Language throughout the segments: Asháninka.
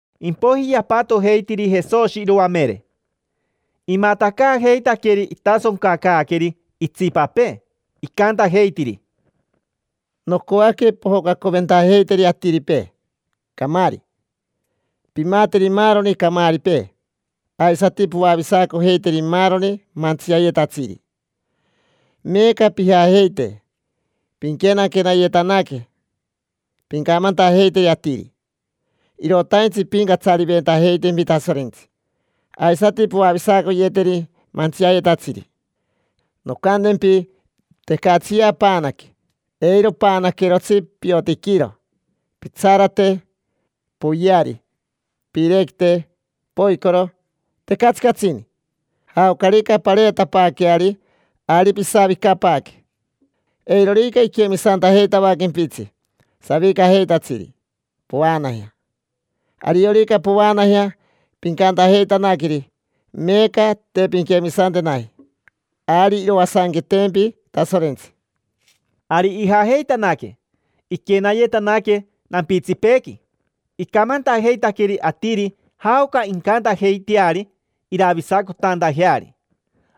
Impoiji yapatojeitiri Jesoshi iroamere, imatacaajeitaqueri itasoncacaaqueri itsipapee, icantajeitiri: —Nocoaque pojocacoventajeiteri atiripee camaari, pimateri maaroni camaaripee, aisati poavisacojeiteri maaroni mantsiayetatsiri. Meeca pijajeite. Pinquenaquenayetanaque, pincamantajeiteri atiri: “Irotaintsi impincatsariventajeitempi Tasorentsi”. Aisati poavisacoyeteri mantsiayetatsiri. Noncantempi, tecatsiya paanaque: eiro paanaquerotsi piotiquiro, pitsarate, poyeari, piirequite, poicoro, tecatsi catsini. Jaocarica pareetapaaqueari, ari pisavicapaaque. Eirorica iquemisantajeitavaquempitsi savicajeitatsiri, povaanajea. Ariorica povaanajea pincantajeitanaqueri: “Meeca te pinquemisantenaji, ari iroasanquetempi Tasorentsi”. Ari ijajeitanaque, iquenayetanaque nampitsipeequi. Icamantajeitaqueri atiri jaoca incantajeiteari iravisacotantajeari.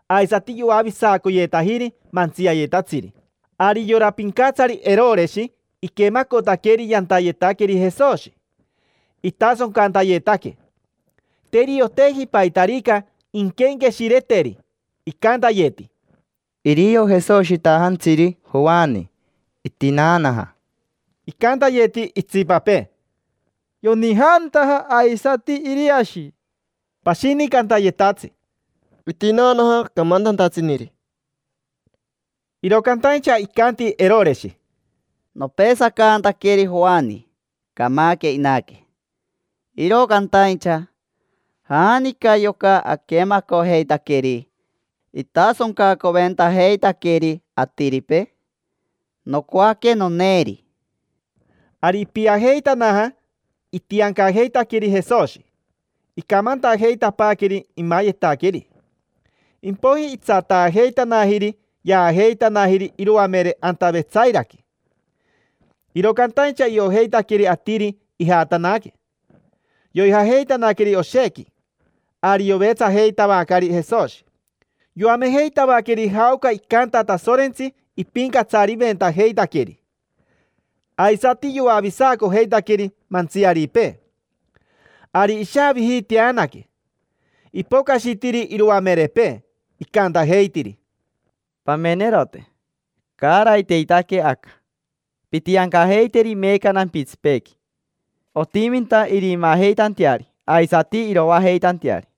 Aisati yoavisacoyetajiri mantsiayetatsiri. Ari yora pincatsari Eroreshi iquemacotaqueri yantayetaqueri Jesoshi, itasoncantayetaque. Te irioteji paitarica inquenqueshireteri. Icantayeti: “Irio Jesoshitajantsiri Joani: itinaanaja”. Icantayeti itsipapee: “Yonijaantaja aisati Iriashi”. Pashini cantayetatsi: “Itinaanaja camantantatsiniri”. Iro cantaincha icanti Eroreshi: —Nopesacantaqueri Joani: camaque inaque. Iro cantaincha, ¿janica yoca aquemacojeitaqueri itasoncacoventajeitaqueri atiripee? Nocoaque noneeri. Ari ipiajeitanaja itiancajeitaqueri Jesoshi, icamantajeitapaaqueri imayetaqueri. Impoiji itsataajeitanajiri yaajeitanajiri iroamere anta Vetsairaqui. Iro cantaincha iojeitaqueri atiri ijatanaque, yoijajeitanaqueri oshequi. Ari yovetsajeitavacari Jesoshi, yoamejeitavaqueri jaoca icanta Tasorentsi ipincatsariventajeitaqueri. Aisati yoavisacojeitaqueri mantsiaripee. Ari ishaavijiiteanaque, ipocashitiri iroamerepee, icantajeitiri: —Pamenerote, caaraiteitaque aca. Pintiancajeiteri meeca nampitsipeequi: otiminta irimaajeitanteari aisati iroajeitanteari.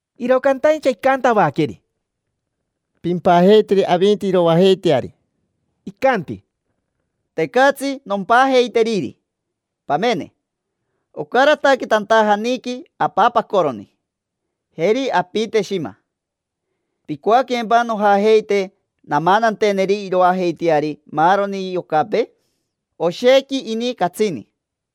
Iro cantaincha icantavaqueri: —Pimpajeiteri avinti iroajeiteari. Icanti: —Tecatsi nompajeiteriri. Pamene, ocarataque tantajaniqui apapacoroni. Jeri apite shima. ¿Picoaquempa nojajeite namananteneri iroajeiteari maaroni yocapee? Oshequi ini catsini.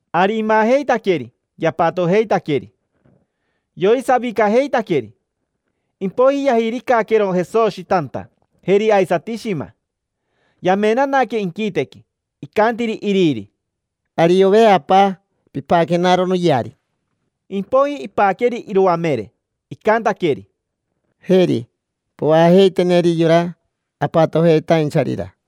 Ari imajeitaqueri, yapatojeitaqueri. Yoisavicajeitaqueri. Impoiji yajiricaquero Jesoshi tanta, jeri aisati shima. Yamenanaque inquitequi, icantiri iriri: “Ariove, Apa, pipaquenaro noyeari”. Impoiji ipaqueri iroamere, icantaqueri: —Jeri, povaajeiteneri yora apatojeitaincharira.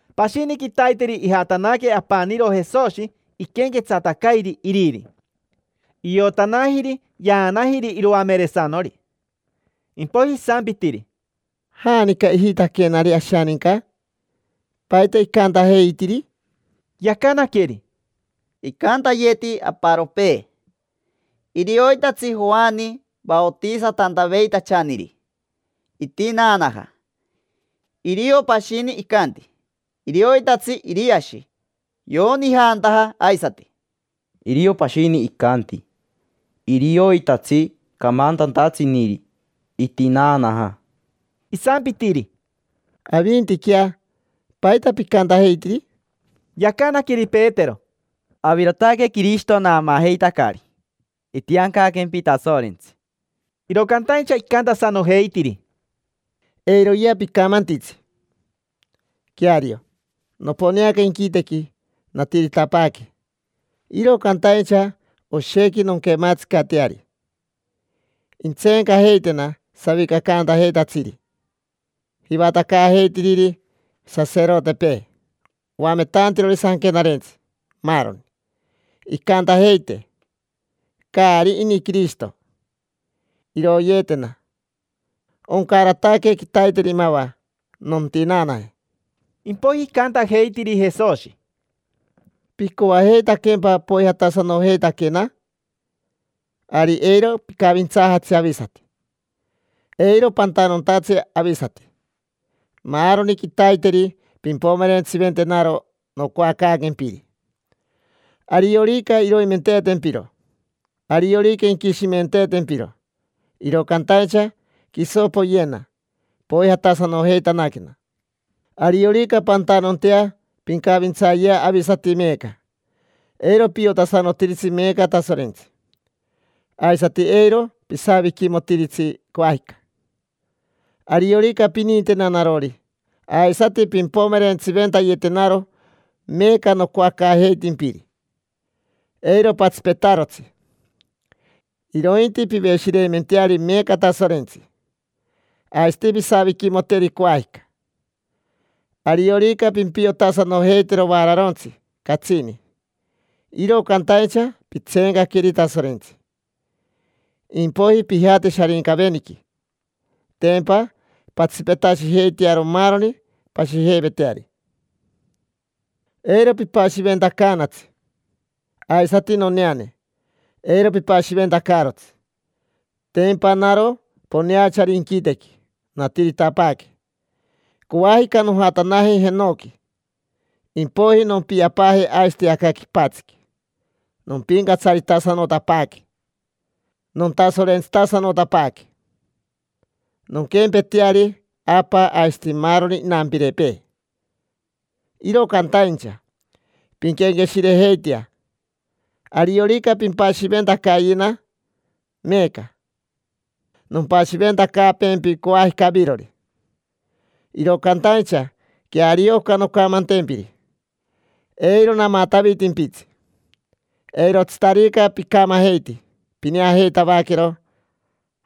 Pashini quitaiteri ijatanaque apaniro Jesoshi iquenquetsatacairi iriri. Iotanajiri yaanajiri iroameresanori. Impoiji isampitiri: —¿Janica ijitaquenari ashaninca? ¿Paita icantajeitiri? Yacanaqueri: —Icantayeti aparopee: “Irioitatsi Joani vaotisatantaveitachaniri, itinaanaja”. Irio pashini icanti: “Irioitatsi Iriashi, yonijaantaja aisati”. Irio pashini icanti: “Irioitatsi camantantatsiniri, itinaanaja”. Isampitiri: —Avintiquea, ¿paita picantajeitiri? Yacanaqueri Petero: —Avirotaque Quirishito naamaajeitacari. Itiancaquempi Tasorentsi. Iro cantaincha icantasanojeitiri: —Eiroyea picamantitsi. Queario, noponeaca inquitequi, natiritapaaque, iro cantaincha oshequi nonquematsicateari. Intseencajeitena savicacantajeitatsiri, jivatacaajeitiriri saserotepee, oametantirori sanquenarentsi, maaroni. Incantajeite: “Caari ini Quirishito”. Iroyeetena, oncarataque quitaiteri mava, nontinaanaje. Impoiji icantajeitiri Jesoshi: —¿Picoajeitaquempa poijatasanojeitaquena? Ari eiro picavintsaajatsi avisati, eiro pantanontatsi avisati. Maaroni quitaiteri pimpomerentsiventenaro nocoacaaquempiri: ariorica iroimenteetempiro, ariorica inquishimenteetempiro. Iro cantaincha quiso poyena, poijatasanojeitanaquena. Ariorica pantanontea pincavintsayea avisati meeca, eiro piotasanotiritsi meeca Tasorentsi, aisati eiro pisaviquimotiritsi coajica. Ariorica pinintena narori, aisati pimpomerentsiventayetenaro meeca nocoacaajeitimpiri, eiro patsipetarotsi, irointi piveshireimenteari meeca Tasorentsi, aisati pisaviquimoteri coajica. Ariorica pimpiotasanojeitero vaararontsi catsini, iro cantaincha pintseenqueri Tasorentsi; impoiji pijate Sharincaveniqui. Tempa pantsipetashijeitearo maaroni pashijeiveteari. Eiro pipashiventacaanatsi; aisati noneane, eiro pipashiventacaarotsi. Tempa naro poneachari inquitequi, natiritapaaque. Coajica nojatanaje jenoqui. Impoiji nompiapaaje aisati aca quipatsiqui, nompincatsaritasanotapaaque, nontasorentsitasanotapaaque: nonquempeteari Apa aisati maaroni inampirepee. Iro cantaincha pinquenqueshirejeitea: ariorica pimpashiventacayena meeca, nompashiventacaaquempi coajica avirori. Iro cantaincha queario oca noncamantempiri, eiro namatavitimpitsi: eirotsitarica picamajeiti, pineajeitavaquero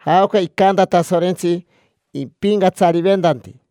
jaoca icanta Tasorentsi ipincatsariventanti.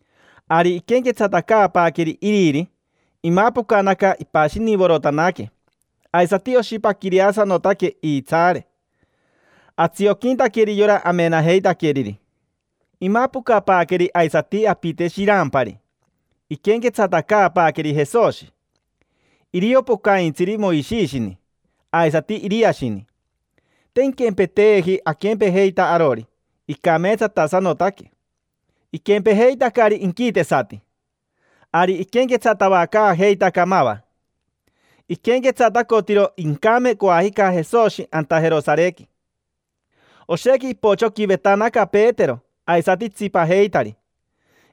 Ari iquenquetsatacaapaaqueri iriri, imapocanaca ipashinivorotanaque, aisati oshipaquireasanotaque iitsaare, atsioquintaqueri yora amenajeitaqueriri. Imapocapaaqueri aisati apite shirampari, iquenquetsatacaapaaqueri Jesoshi. Irio pocaintsiri Moishishini aisati Iriashini; te inquempeteeji aquempejeita arori, icameetsatasanotaque: iquempejeitacari inquitesati. Ari iquenquetsatavacaajeitaca mava: iquenquetsatacotiro incame coajica Jesoshi anta Jerosarequi. Oshequi ipochoquivetanaca Petero aisati itsipajeitari,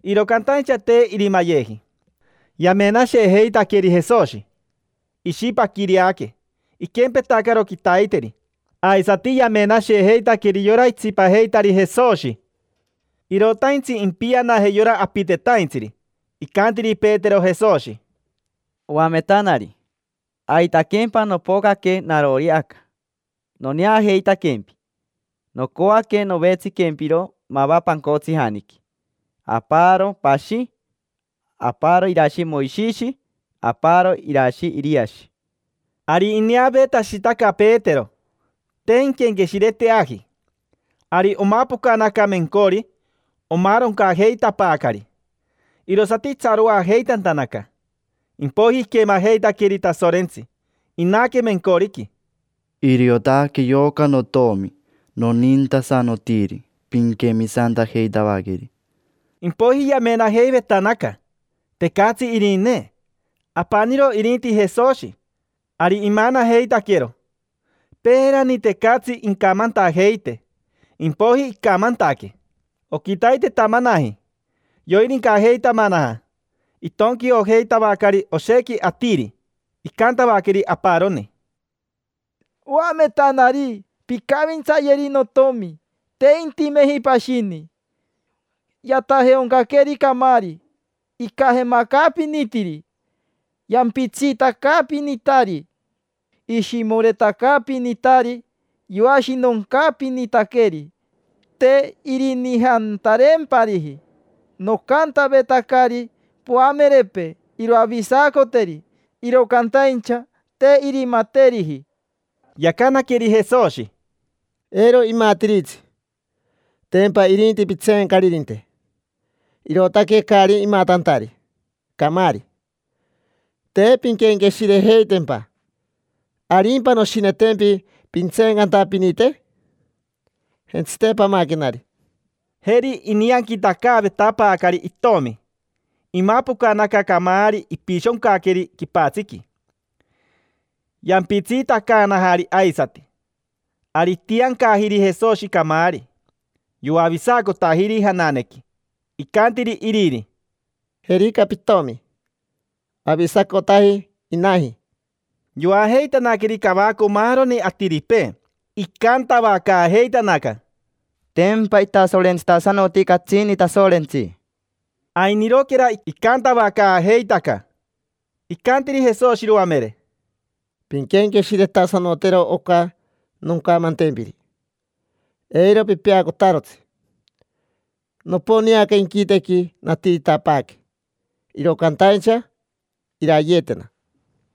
iro cantaincha te irimayeji. Yamenashejeitaqueri Jesoshi, ishipaquireaque, iquempetacaro quitaiteri. Aisati yamenashejeitaqueri yora itsipajeitari Jesoshi. Irotaintsi impianaje yora apitetaintsiri, icantiri Petero Jesoshi: —Oametanari, aitaquempa nopocaque narori aca, noneajeitaquempi. Nocoaque novetsiquempiro mava pancotsijaniqui: aparo pashi, aparo irashi Moishishi, aparo irashi Iriashi. Ari ineaveetashitaca Petero, te inquenqueshireteaji. Ari omapocanaca mencori, omaaroncajeitapaacari, irosati itsaroajeitantanaca. Impoiji iquemajeitaqueri Tasorentsi, inaque mencoriqui: —Iriotaque yoca notomi nonintasanotiri: pinquemisantajeitavaqueri. Impoiji yamenajeivetanaca: tecatsi irinee, apaniro irinti Jesoshi. Ari imanajeitaquero: peerani, tecatsi incamantajeite. Impoiji, icamantaquee. Oquitaitetamanaji, yoirincajeitamanaja, itonquiojeitavacari oshequi atiri. Icantavaqueri aparoni: —Oametanari, pincavintsayeri notomi, te intimeji pashini. Yatajeaoncaqueri camaari, icajemacaapinitiri. Yampitsiitacaapinitari, ishimoretacaapinitari. Yoashinoncaapinitaqueri: te irinijantareempariji. Nocantavetacari poamerepee iroavisacoteri, iro cantaincha te irimateriji. Yacanaqueri Jesoshi: —Eiro imatiritsi: tempa irinti pitseencaririnte, irootaque caari imatantari camaari; te pinquenqueshirejeitempa. ¿Arimpa noshinetempi pintseencantapinite? Jentsite pamaquenari. Jeri inianquitacaavetapaacari itomi, imapocanaca camaari ipishoncaqueri quipatsiqui, yampitsiitacaanajari aisati. Ari itiancajiri Jesoshi camaari, yoavisacotajiri jananequi. Icantiri iriri: —Jerica pitomi: avisacotaji inaji. Yoajeitanaqueri cavaco maaroni atiripee icantavacaajeitanaca: —Tempa itasorentsitasanoti catsini Tasorentsi. Ainiroquera icantavacaajeitaca, icantiri Jesoshi iroamere: —Pinquenqueshiretasanotero oca noncamantempiri. Eiro pipeacotarotsi. Noponeaca inquitequi, natiritapaaque, iro cantaincha irayeetena.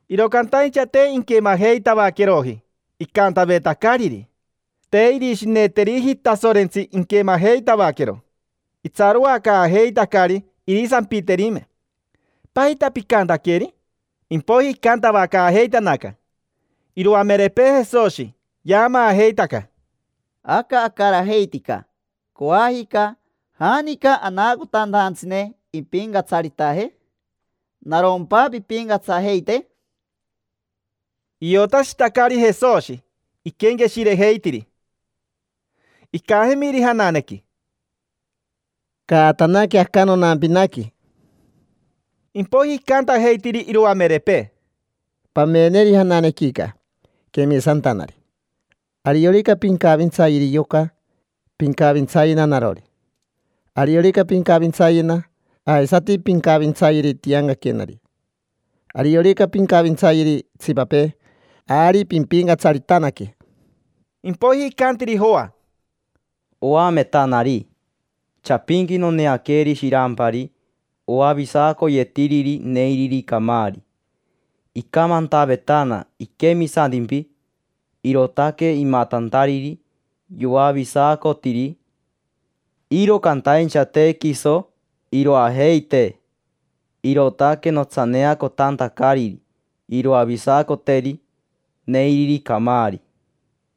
Iro cantaincha te inquemajeitavaqueroji icantavetacariri. Te irishineteriji Tasorentsi inquemajeitavaquero. Itsaroacaajeitacari irisampiterime: “¿Paita picantaqueri?” Impoiji icantavacaajeitanaca iroamerepee Jesoshi, yaamaajeitaca: —Aca acarajeitica: coajica, ¿janica anaacotantajantsine impincatsaritaje? ¿Narompa pimpincatsajeite? Iotashitacari Jesoshi iquenqueshirejeitiri. Icajemiri jananequi: —Caatanaque aca nonampinaqui. Impoiji icantajeitiri iroamerepee: —Pameneri jananequica, quemisantanari. Ariorica pincavintsayeri yoca, pincavintsayena narori. Ariorica pincavintsayena, aisati pincavintsayeri tiancaquenari. Ariorica pincavintsayeri itsipapee, ari pimpincatsaritanaque. Impoiji icantiri Joa: —Oametanari, chapinqui noneaqueri shirampari oavisacoyetiriri neiriri camaari. Icamantavetana iquemisantimpi, irootaque imatantariri yoavisacotiri. Iro cantaincha te quiso iroajeitee, irootaque notsaneacotantacariri iroavisacoteri neiriri camaari.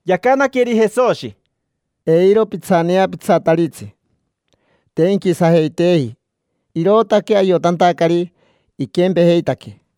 Yacanaqueri Jesoshi: —Eiro pitsaneapitsataritsi. Te inquisajeiteeji, irootaque ayotantacari iquempejeitaquee.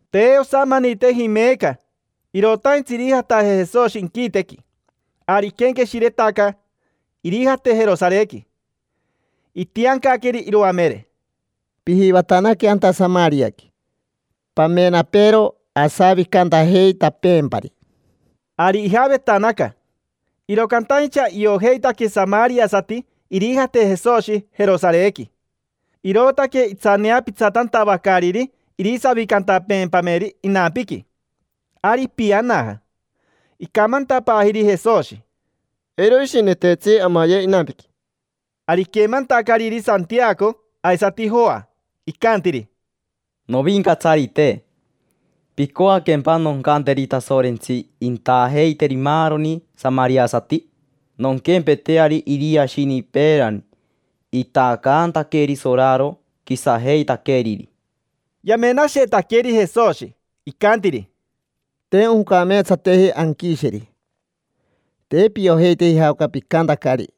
Te osamaniteji meeca: irotaintsi irijataje Jesoshi inquitequi. Ari iquenqueshiretaca irijate Jerosarequi. Itiancaqueri iroamere: —Pijivatanaque anta Samariaqui, pamenapeero asavicantajeitapeempari. Ari ijavetanaca, iro cantaincha iojeitaque samariasati irijate Jesoshi Jerosarequi, irootaque itsaneapitsatantavacariri irisavicantapeempameri inampiqui. Ari ipianaja, icamantapaajiri Jesoshi: —Eiro ishineteetsi amaye inampiqui. Ari iquemantacariri Santiaco aisati Joa, icantiri: —¿Novincatsarite, picoaquempa noncanteri Tasorentsi intaajeiteri maaroni samariasati? Nonquempeteari Iriashini peerani: itaacantaqueri soraro quisajeitaqueriri. Yamenashetaqueri Jesoshi, icantiri: —Te oncameetsateji anquisheri. Te piojeiteji jaoca picantacari: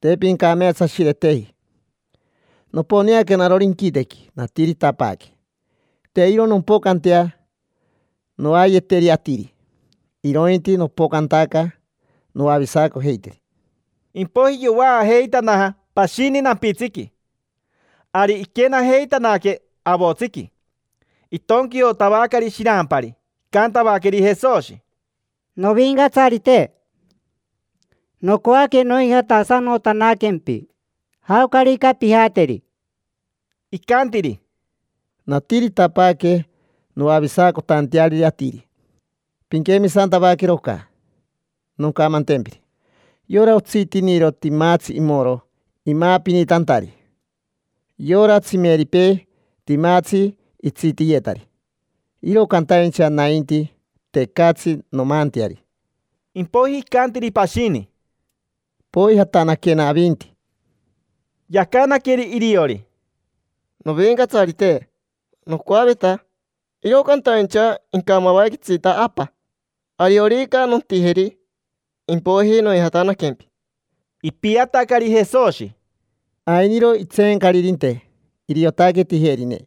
te pincameetsashireteji. Noponeaca narori inquitequi, natiritapaaque. Te iro nompocantea noayeteri atiri, irointi nopocantaca noavisacojeiteri. Impoiji yovaajeitanaja pashini nampitsiqui. Ari iquenajeitanaque avotsiqui, itonquiotavacari shirampari, icantavaqueri Jesoshi: —Novincatsarite, nocoaque noijatasanotanaquempi, jaocarica pijateri. Icantiri: —Natiritapaaque noavisacotanteariri atiri. Pinquemisantavaquero oca noncamantempiri: yora otsitiniro timatsi imoro imaapinitantari, yora tsimeripee timatsi itsitiyetari; iro cantaincha nainti, tecatsi nomaanteari. Impoiji icantiri pashini: —Poijatanaquena avinti. Yacanaqueri iriori: —Novincatsarite, nocoaveta, iro cantaincha incamavaquetsita apa. Ariorica nontijeri, impoiji noijatanaquempi. Ipiatacari Jesoshi: —Ainiro itseencaririnte, iriotaque tijerine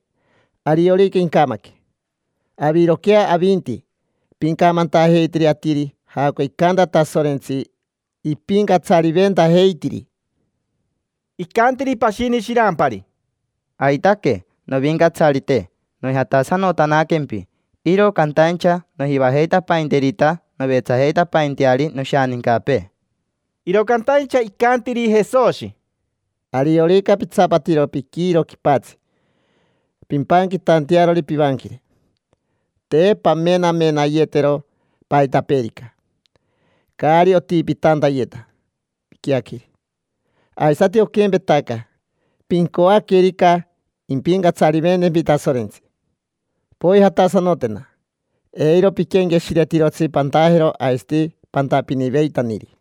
ariorica incamaque. Aviroquea avinti, pincamantajeiteri atiri jaoca icanta Tasorentsi ipincatsariventajeitiri. Icantiri pashini shirampari: —Aitaque, novincatsarite, noijatasanotanaquempi: iro cantaincha nojivajeitapainterita novetsajeitapainteari noshanincapee. Iro cantaincha icantiri Jesoshi: —Ariorica pitsapatiro piquiiro quipatsi pimpanquitantearori pivanquire, te pamenamenayetero paitapeerica, caari otipitantayeta piquiaqueri. Aisati oquempetaca: pincoaquerica impincatsariventempi Tasorentsi, poijatasanotena, eiro piquenqueshiretirotsi pantajero aisati pantapiniveitaniri.